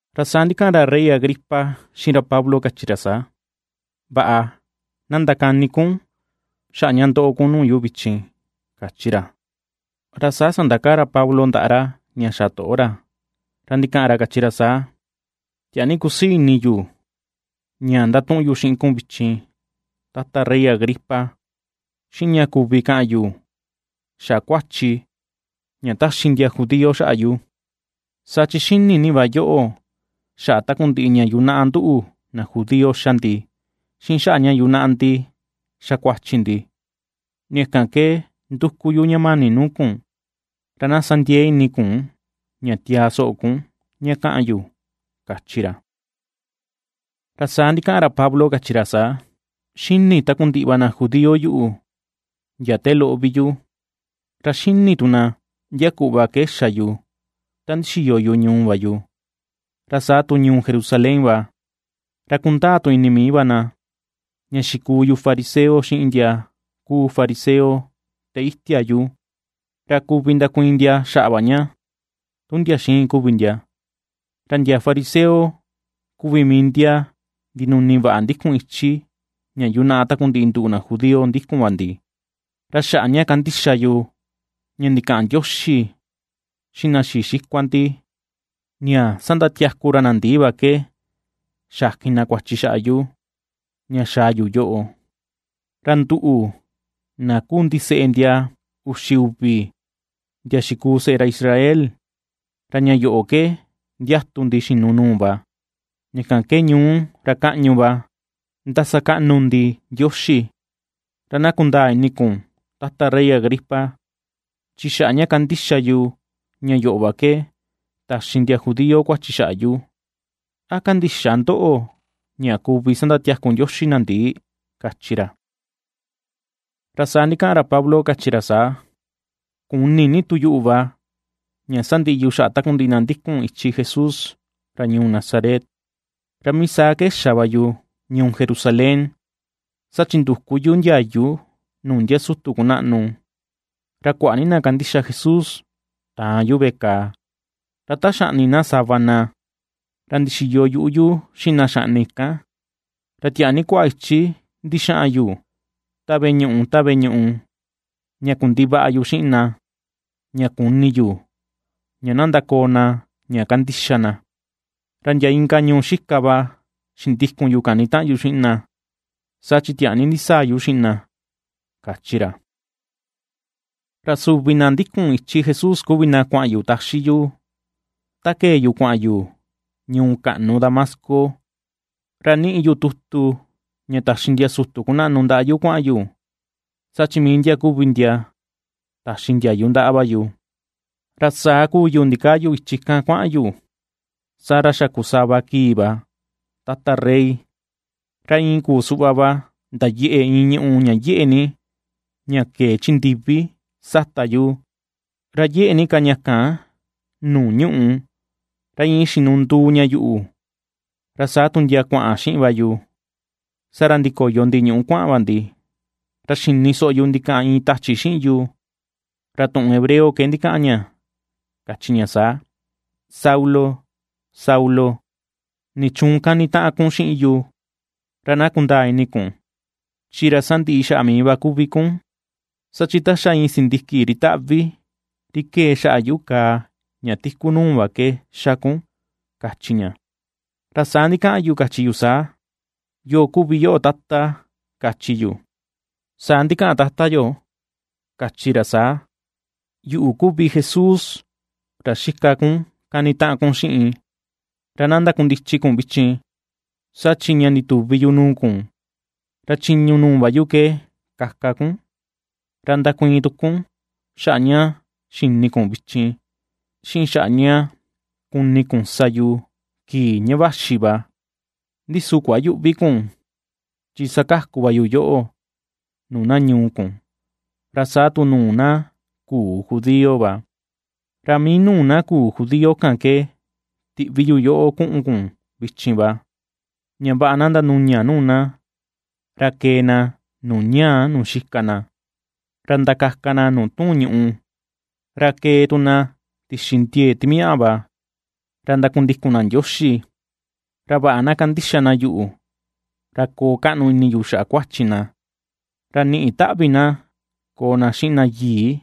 Ra saa ndikaꞌan ra rey Agripa xiꞌin ra Pablo, kachi ra saa: ―Vaꞌa, na ndakani kun xaꞌa ña ndoꞌo kun nuu yu vichin ―kachi ra. Ra saa sandakaa ra Pablo ndaꞌa ra ña xa toꞌo ra, ra ndikaꞌan ra kachi ra saa: ―Tiaa ni kusii ini yu ña ndatuꞌun yu xiꞌin kun vichin, Tata rey Agripa, xiꞌin ña kuvi kaꞌan yu xaꞌa kuachi ña taxi ndia judío xaꞌa yu. Saa chi xini ni va yoꞌo, xaꞌa takundiꞌi ña yunaꞌa nduꞌu na judío xa ndi, xiꞌin xaꞌa ña yunaꞌa ndi xa kuachi ndi. Ña kan ke nduku yu ña mani nuu kun, ra na sa ndiee ini kun, ña tiaa soꞌo kun ña kaꞌan yu ―kachi ra. Ra saa ndikaꞌan ra Pablo, kachi ra saa: ―Xini takundiꞌi va na judío yuꞌu ndia te loꞌo vi yu, ra xini tu na ndia kuꞌva ke xa yu ta ndixiyo yu ñuu va yu, ra saa tu ñuu Jerusalén va. Ra kundaa tu ini mii va na, ña xikuu yu Fariseo xiꞌin ndia kuu fariseo te itia yu, ra kuvi ndakuiin ndia xaꞌa va ña, tu ndia xiin kuvi ndia, ra ndia fariseo kuvi mii ndia ndinuni vaꞌa ndikun ichi ña yunaꞌa takundiꞌi nduꞌu na judío ndikun va ndi. Ra xaꞌa ña kandixa yu, ña ndikaꞌan Ndioxi xiꞌin na xii xikua ndi, ña sandatiaku ra na ndii va ke xakin na kuachi xaꞌa yu, ña xaa yu yoꞌo. Ra nduꞌu, na ^kuu ndiseꞌe ndia uxi uvi ndia xikuu seꞌe ra Israel, ra ña yoꞌo ke ndiatu ndi xinu nuu va; ña kan ke ñuu, ra kaꞌñu va, ndasakaꞌnu ndi Ndioxi. Ra na kundaa ini kun, Tata rey Agripa, chi xaꞌa ña kandixa yu, ña yoꞌo va ke, taxi ndia judío kuachi xaꞌa yu. ¿A kandïxa ndoꞌo ña kuvi sandatiaku Ndioxi na ndii? ―kachi ra. Ra saa ndikaꞌan ka Pablo kachi ra saa: ―Kuni ni tu yuꞌu va, ña sandiꞌi yu xaꞌa takundiꞌi na ndikun ichi Jesús ra ñuu Nazaret. Ra mii saa ndixa ke xa va yu ñuu Jerusalén. Saa chi nduku yu ndiayu nuu ndia sutu ndia kunaꞌnu, ra kuaꞌa ni na kandixa Jesús taan yu veꞌe kàà, ra ta xaꞌni na sava na, ra ndixiyo tu yuꞌu yu xiꞌin na xaꞌni kan. Ra tiaa ni kuaꞌa ichi ndixaꞌan yu, ta veꞌe ñuꞌu ta veꞌe ñuꞌu, ña kundivaꞌa yu xiꞌin na, ña kuni yu ña na ndakoo na ña kandixa na. Ra ndia inka ñuu xika va xindikun yu kanitaꞌan yu xiꞌin na, saa chi tiaa ni ndisaa yu xiꞌin na ―kachi ra. ’Ra suvi na ndikun ichi Jesús kuvi na kuaꞌan yu taxi yu, ta kee yu kuaꞌan yu ñuu kaꞌnu Damasco, ra niꞌi yu tutu ña taxi ndia sutu kunaꞌnu ndaꞌa yu kuaꞌan yu, saa chi mii ndia kuvi ndia taxi ndiayu ndaꞌa va yu. Ra saa kuu yu ndikaa yu ichi kan kuaꞌan yu, saa ra xa kuu sava kii va, Tata rey, ra iin ku suꞌva va ndayeꞌe iin ñuꞌu ña yeꞌe ni, ña kee chi ndivi, sata yu, ra yeꞌe ni ka ña kan nuu ñuꞌù, ra iin xinunduu ña yuꞌu, ra saa tu ndia kuaꞌan xiꞌin va yu. Saa ra ndikoyo ndi ñuꞌu kuaꞌan va ndi, ra xini soꞌo yu ndikaꞌan iin tachi xiꞌin yu, ra tuꞌun hebreo ke ndikaꞌan ña kachi ña saa: “Saulo, Saulo, ¿nichuun kanitaꞌan kun xiꞌin yu? Ra na kundaa ini kun, chi ra sandiꞌi xaꞌa mii va kuvi kun, saa chi ta xa iin sindiki ri taꞌvi, ri kee xaꞌa yuꞌu kàà ña tiku nuu, va ke xa kun”, kachi ña. Ra saa ndikaꞌan yu, kachi yu saa: “¿Yoo kuvi yoꞌo Tata?” kachi yu. Saa ndikaꞌan Tata yo kachi ra saa: “Yuꞌu kuvi Jesús ra xika kun kanitaꞌan kun xiꞌin. Ra na ndakundichi kun vichin, saa chi ña ndituvi yu nuu kun, ra chiñu nuu va yu ke kaka kun, ra ndakuiin tu kun xaꞌa ña xini kun vichin, xiꞌin xaꞌa ña kuni kun sa yu kii ña vaxi va. Ndi su kuayüꞌvi kun, chi sakaku va yu yoꞌo nuu na ñuu kun, ra saa tu nuu na küu judío va, ra mii nuu na küu judío kan ke tiꞌvi yu yoꞌo kuꞌun kun vichin va. Ña vaꞌa na ndanuña nuu na, ra kee na nuu ñaa nuu xika na, ra ndakaka na nuu tuun ñuꞌu, ra kee tu na tixi ndiee timiaꞌa va, ra ndakundikun na Ndioxi, ra vaꞌa na kandixa na yuꞌu, ra koo kaꞌnu ini yu xaꞌa kuachi na, ra niꞌi taꞌvi na koo na xiꞌin na yii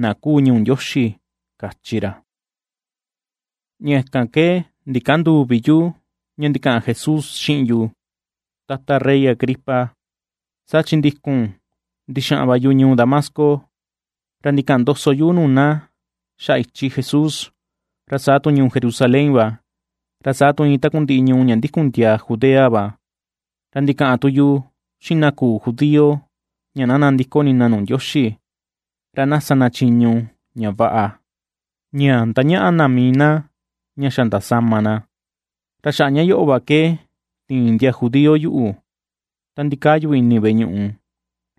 na kuu ñuu Ndioxi”, kachi ra. ’Ña kan ke ndikänduu vi yu, ña ndikaꞌan Jesús xiꞌin yu, Tata rey Agripa. Saa chi ndikun, ndixaꞌan va yu ñuu Damasco, ra ndikaꞌan ndoso yu nuu na xaꞌa ichi Jesús, ra saa tu ñuu Jerusalén va, ra saa tu iin takundiꞌi ñuu ña ndikun ndiaa Judea va, ra ndikaꞌan tu yu xiꞌin na küu judío ña na nandiko ini na nuu Ndioxi, ra na sa na chiñu ña vaꞌa, ña ndañaꞌa na mii na ña xa ndasama na. Ra xaꞌa ña yoꞌo va ke tiin ndia judío yuꞌu, ta ndikaa yu ini veꞌe ñuꞌu,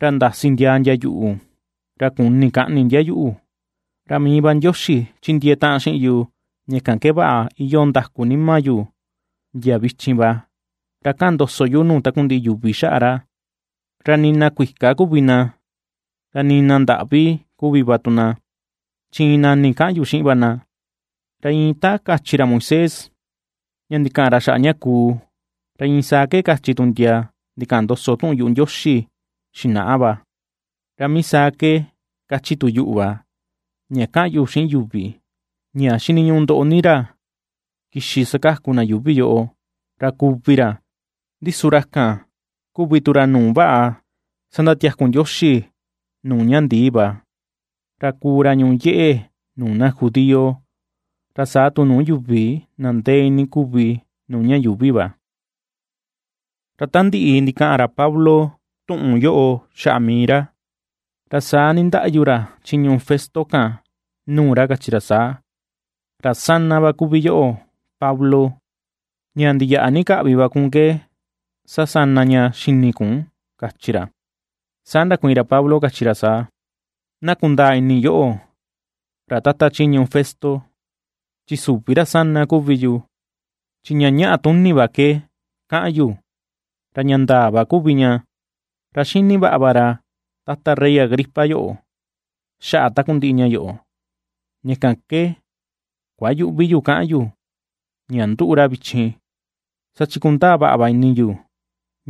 ra ndasi ndiaa ndia yuꞌu, ra kuni kaꞌni ndia yuꞌu. Ra mii va Ndioxi chindiee taꞌan xiꞌin yu, ña kan ke vaꞌa iyoo ndaku nima yu ndia vichin va, ra kaꞌan ndoso yu nuu takundiꞌi yuvi xaꞌa ra, ra nii na kuika kuvi na, ra nii na ndaꞌvi kuvi va tu na, chi iin nani kaꞌan yu xiꞌin va na. Ra iin ta kachi ra Moisés ña ndikaꞌan xaꞌa ña kuu, ra iin saa ke kachi tu ndia, ndikaꞌan ndoso tuꞌun yuꞌu Ndioxi xinaꞌa va, ra mii saa ke kachi tu yuꞌu va, ña kaꞌan yu xiꞌin yuvi: ña xiniñuꞌu ndoꞌo ni ra kixi sakaku na yuuvi yoꞌo, ra kuvi ra, ndi su ra kan kuvi tu ra nuu vaꞌa sandatiaku Ndioxi nuu ña ndii va, ra kuu ra ñuꞌu yeꞌe nuu na judío, ra saa tu nuu yuvi na ndee ini kuvi nuu ña yuuvi va. Ra ta ndiꞌi ndikaꞌan ra Pablo tuꞌun yoꞌo xaꞌa mii ra, ra saa nindaꞌyu ra chiñu Festo kan, nuu ra kachi ra saa: ―¡Ra sana va kuvi yoꞌo, Pablo! Ña ndiyaꞌa ni kaꞌvi va kun ke sasana ña xini kun ―kachi ra. Saa ndakuiin ra Pablo, kachi ra saa: ―Na kundaa ini yoꞌo, ra Tata chiñu Festo, chi süvi ra sana kuvi yu, chi ña ñaꞌa tuni vaꞌa ke kaꞌan yu, ra ña ndaa va kuvi ña. Ra ^xini vaꞌa va ra Tata rey Agripa yoꞌo, xaꞌa takundiꞌi ña yoꞌo; ña kan ke kuayüꞌvi yu ^kaꞌan yu, ña ^nduꞌu ra vichin, saa chi kundaa vaꞌa va ini yu,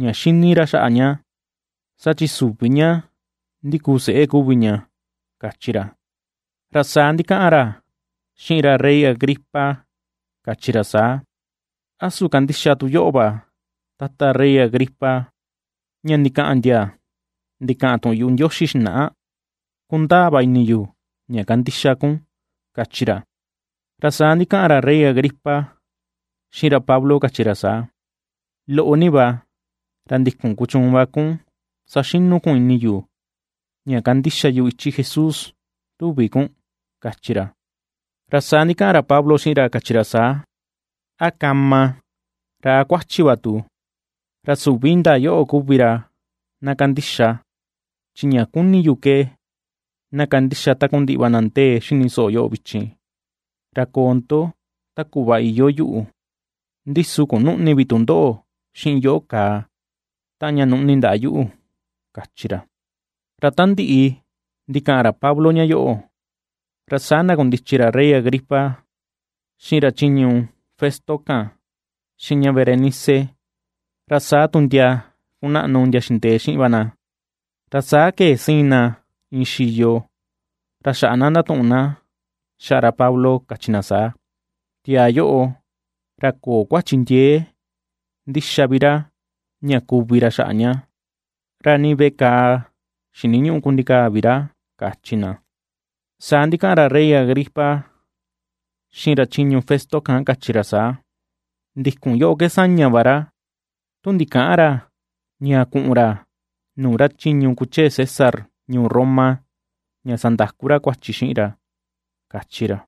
ña xini ra xaꞌa ña, saa chi süvi ña ndikuu seꞌe kuvi ña ―kachi ra. Ra saa ndikaꞌan ra xiꞌin ra rey Agripa kachi ra saa: ―¿A su kandixa tu yoꞌo va, Tata rey Agripa, ña ndikaꞌan ndia ndikaꞌan tuꞌun yu Ndioxi xinaꞌa? Kundaa va ini yu ña kandixa kun ―kachi ra. Ra saa ndikaꞌan ra rey Agripa, xiꞌin ra Pablo kachi ra saa: ―Loꞌo ni va, ra ndikun kuchuun va kun saxinu kun ini yu, ña kandixa yu ichi Jesús, ¿tuvi kun? ―kachi ra. Ra saa ndikaꞌan ra Pablo xiꞌin ra kachi ra saa: ―A kama, ra a kuachi va tu, ra süvi indaa yoꞌo kuvi ra na kandixa, chi ña kuni yu ke, na kandixa takundiꞌi va na ndee xini soꞌo yoꞌo vichin, ra koo ndo ta kuꞌva iyoo yuꞌu, ndi su kunüꞌni vi tu ndoꞌo xiꞌin yoꞌo kàà, taꞌan ña nuꞌni ndaꞌa yuꞌu ―kachi ra. Ra ta ndiꞌi ndikaꞌan ra Pablo ña yoꞌo, ra saa ndakundichi ra rey Agripa, xiꞌin ra chiñu Festo kan, xiꞌin ña Berenice, ra saa tu ndia kunaꞌnu ndia xindee xiꞌin va na. Ra saa kee siin na iin xiyo, ra xaꞌa na ndatuꞌun na xaꞌa ra Pablo kachi na saa: ―Tiaa yoꞌo, ra köo kuachi ndiee ndi xa vi ra, ña kuvi ra xaꞌa ña, ra nii veꞌe kàà xiniñüꞌu kundikaa vi ra ―kachi na. Saa ndikaꞌan ra rey Agripa xiꞌin ra chiñu Festo kan kachi ra saa: ―Ndikun yoꞌo ke saña va ra, tu ndikäꞌan ra, ña kuꞌun ra nuu ra chiñu kuchee César ñuu Roma, ña sandaku ra kan kuachi xiꞌin ra ―kachi ra.